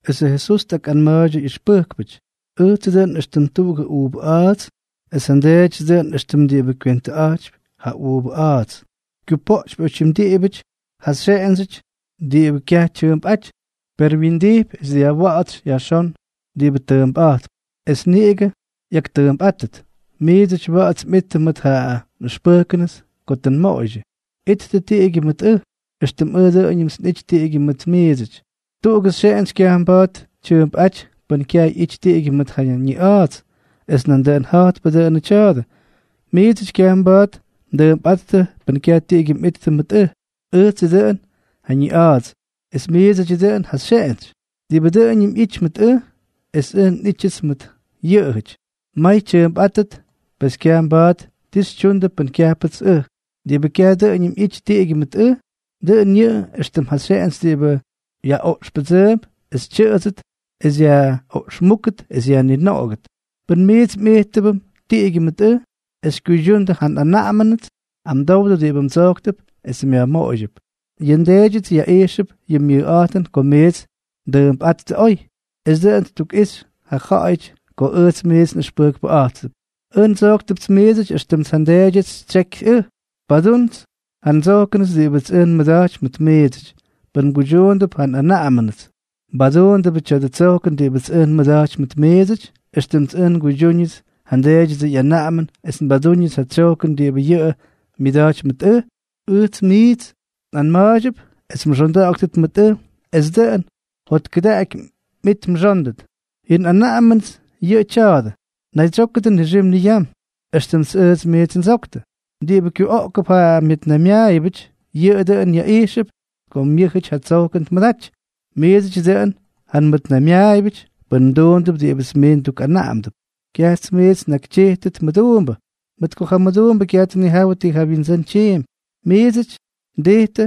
Esʉ Jesús tꞌakꞌanma̱a̱ydyʉ ꞌyʉxpʉjkpʉty: —Ʉjtsʉ dʉꞌʉn éxtʉm tuꞌugʉ uuvʉ a̱a̱ts, es ja nDeedyʉts dʉꞌʉn éxtʉm diꞌibʉ kywentʉꞌa̱jtypy ja uuvʉ a̱a̱ts. Kyupoꞌtypy oytyim diꞌibʉty ja nxeꞌendsyʉts diꞌibʉ kyaj tyʉʉmpꞌáty, per wyindijpy es dyajwa̱ꞌa̱tsy yajxón diꞌibʉ tʉʉmpꞌa̱jtp, es niꞌigʉ ꞌyaktʉʉmpꞌátʉt. Miidsʉty wa̱ꞌa̱ts mꞌittʉ mʉt ja nꞌʉxpʉjkʉnʉts ko tʉ nmoꞌoydyʉ. Ittʉ tiꞌigyʉ mʉt ʉj, éxtʉm ʉj dʉꞌʉñʉmts nꞌity tiꞌigyʉ mʉt miidsʉty. Tuꞌugʉ xeꞌentsy kyaj mba̱a̱t tyʉʉmpꞌáty pʉn kyaj ꞌyity tiꞌigyʉ mʉt ja ñiꞌa̱a̱ts, es nandʉꞌʉn ja̱jtpʉ dʉnʉ tya̱a̱dʉ, miidsʉty kyaj mba̱a̱t mdʉʉmpꞌáttʉ pʉn kyaj tiꞌigyʉ mꞌittʉ mʉt ʉj. ’Ʉjtsʉ dʉꞌʉn ja ñiꞌa̱a̱ts, es miidsʉdyʉ dʉꞌʉn ja xyeꞌentsy. Diꞌibʉ dʉꞌʉñʉm ꞌyity mʉt ʉj, es ʉj nꞌítyʉts mʉt yʉꞌʉjʉty, may tyʉʉmpꞌátʉt; pes kyaj mba̱a̱t ti xytyundʉ pʉn kyajpʉts ʉj. Diꞌibʉ kyaj dʉꞌʉñʉm ꞌyity tiꞌigyʉ mʉt ʉj, dʉꞌʉn yʉꞌʉ éxtʉm ja xeꞌentsy diꞌibʉ yaꞌoꞌxpʉdsʉʉmp es tyʉꞌʉdsʉt es yaꞌoꞌxmúkʉt es yajninoꞌogʉt. ’Pʉn miits mꞌijttʉbʉm tiꞌigyʉ mʉt ʉj, es xykyuydyundʉ ja nꞌanaꞌamʉnʉts, amdowdʉ diꞌibʉ mdsojktʉp es myajmoꞌoydyʉp. Yʉ nDeedyʉts yaꞌijxʉp yʉ myʉjꞌa̱jtʉn ko miits mdʉʉmpꞌáttʉ oy, es dʉꞌʉn ttukꞌixy ja ja̱ꞌa̱yʉty ko ʉjts miits nꞌʉxpʉjkpʉꞌa̱jttʉp. Ʉj ndsojktʉpts miidsʉty éxtʉmts ja nDeedyʉts xytsyékyʉts ʉj. Padúndʉts ja ndsojkʉnʉts diꞌibʉts ʉj nmʉda̱jtypy mʉt miidsʉty. Pʉn mguydyuundʉp ja nꞌanaꞌamʉnʉts, mbadúndʉbʉ tya̱dʉ tsojkʉn diꞌibʉts ʉj nmʉda̱jtypy mʉt miidsʉty, éxtʉmts ʉj nguydyúñʉts ja nDeedyʉdsʉ ꞌyanaꞌamʉn es mbadúñʉts ja tsyojkʉn diꞌibʉ yʉꞌʉ myʉda̱jtypy mʉt ʉj. Ʉjts miits nꞌanma̱a̱ydyʉp es mxonda̱ꞌa̱ktʉt mʉt ʉj es dʉꞌʉn jotkʉdaꞌaky mꞌit mxóndʉt. Yʉ nꞌanaꞌamʉnʉts yʉꞌʉ tya̱a̱dʉ: Naydsyókʉdʉ nixim niyam, éxtʉmts ʉj miits ndsoktʉ. Diꞌibʉ kyuꞌoogʉp ja myʉtnaymyaayʉbʉty, yʉꞌʉ dʉꞌʉn yaꞌijxʉp ko myʉ́jʉty ja tsojkʉn tmʉdaty. Miidsʉdyʉ dʉꞌʉn ja nmʉtnaymyaayʉbʉty pʉn mduundʉp diꞌibʉts miits ndukꞌanaꞌamdʉp. Kyajts miits nnakytyijtʉp mʉduumbʉ, mʉt ko ja mʉduumbʉ kyaj tnijawʉ ti ja wyindsʉ́n tyiimpy. Miidsʉty ndijtʉ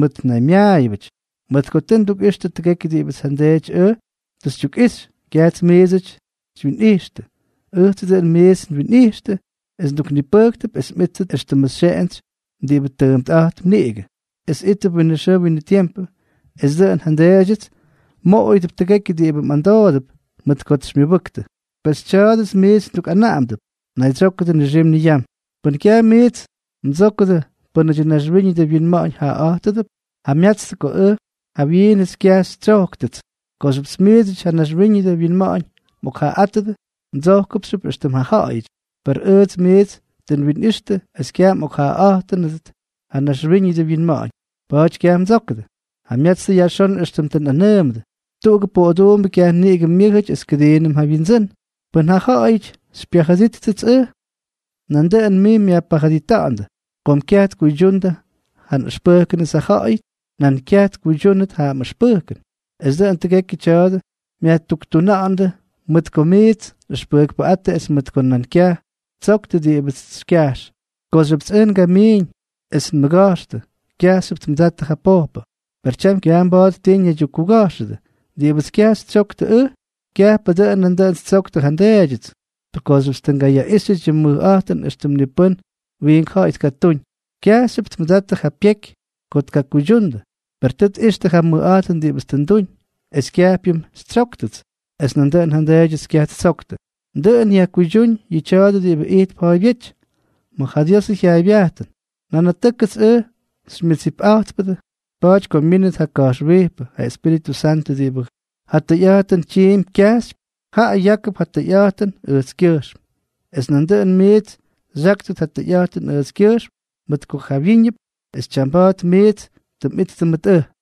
mʉtnaymyaayʉbʉty, mʉt ko tʉ ndukꞌixtʉ tʉgekyʉ diꞌibʉts ja nDeety ʉj tʉ xytyukꞌixy. Kyajts miidsʉty xywyinꞌijxtʉ. Ʉjtsʉ dʉꞌʉn miits nwinꞌijxtʉ es nduknipʉjktʉp es mꞌíttʉt éxtʉmʉ xeꞌentsy diꞌibʉ tʉʉmpꞌa̱jtp niꞌigʉ, es ítʉp winʉ xʉʉ winʉ tiempʉ, es dʉꞌʉn ja nDeedyʉts mmoꞌoyʉdʉp tʉgekyʉ diꞌibʉ mꞌamdoodʉp mʉt kots xymyʉbʉktʉ. Pesʉ tya̱a̱dʉts miits ndukꞌanaꞌamdʉp: Naydsyókʉdʉ nixim niyam. ’Pʉn kyaj miits mdsókʉdʉ pʉ́nʉdyʉ naxwíñʉdʉ winma̱ꞌa̱ñ jaꞌaꞌa̱jtʉdʉp, jamyatstʉ ko ʉj jawyiinʉts kyaj xytsyojktʉts. Kooxyʉp miidsʉty ja naxwíñʉdʉ winma̱ꞌa̱ñ mꞌokjaꞌaꞌátʉdʉ, mdsojkʉpxyʉp éxtʉm ja jyaꞌajʉty. Per ʉjts miits tʉ nwinwitstʉ es kyaj mꞌokjaꞌaꞌa̱jttʉnʉt ja naxwíñʉdʉ winma̱ꞌa̱ñ, pa̱a̱ty kyaj mdsókʉdʉ. Jamyatstʉ yajxón éxtʉm tʉ nꞌanʉʉmʉdʉ. Tuꞌugʉ poꞌoduumbʉ kyaj niꞌigʉ myʉ́jʉty es kʉdiinʉm ja wyindsʉ́n. Pʉn ja ja̱ꞌa̱yʉty xypyajʉdijttʉts ʉj, nandʉꞌʉn miits myajpajʉdita̱ꞌa̱ndʉ. Kom kyaj tkuydyuundʉ ja nꞌʉxpʉjkʉnʉts ja ja̱ꞌa̱yʉty, nan kyaj tkuydyúndʉt ja mꞌʉxpʉjkʉn. Es dʉꞌʉn tʉgekyʉ tya̱a̱dʉ myajtuktuna̱ꞌa̱ndʉ mʉt ko miits nꞌʉxpʉjkpʉꞌáttʉ es mʉt ko nan kyaj ttsoktʉ diꞌibʉts xykyajx. ’Kooxyʉpts ʉj ngamiiñ es nmʉga̱jxtʉ, kyajxyʉp tmʉdattʉ ja pojpʉ. Per tyam kyaj mba̱a̱t ti ñaydyukkuga̱jxʉdʉ. Diꞌibʉts kyaj xytsyoktʉ ʉj, kyajpʉ dʉꞌʉn nandʉꞌʉn ttsoktʉ ja nDeedyʉts. Kooxyʉpts tʉ ngayaꞌíxyʉty yʉ mʉjꞌa̱jtʉn éxtʉm ni pʉ́n wiink ja̱ꞌa̱y tkatúñ, kyajxyʉp tmʉdattʉ ja pyeky ko tkakuydyundʉ. Per tʉ tꞌixtʉ ja mʉjꞌa̱jtʉn diꞌibʉts tʉ nduñ, es kyajpyʉm xytsyóktʉts, es nandʉꞌʉn ja nDeedyʉts kyaj ttsoktʉ. Dʉꞌʉn yajkuydyúñ yʉ tya̱a̱dʉ diꞌibʉ ijtp ja̱a̱ybyéty ma̱ ja Diosʉ jyaaybyajtʉn: “Nanatʉ́kʉts ʉj xymyʉdsipꞌa̱jtpʉdʉ.” ’Pa̱a̱ty ko myínʉt ja Ka̱jxwijpʉ, ja Espíritʉ Santʉ diꞌibʉ ja tʉyꞌa̱jtʉn tyiimpy kyajxypy, jaꞌa yákʉp ja tʉyꞌa̱jtʉn ʉjtskyʉjxm. Es nandʉꞌʉn miits xyáktʉt ja tʉyꞌa̱jtʉn ʉjtskyʉjxm, mʉt ko jawyíñʉp es tyamba̱a̱t miits tʉ mꞌittʉ mʉt ʉj.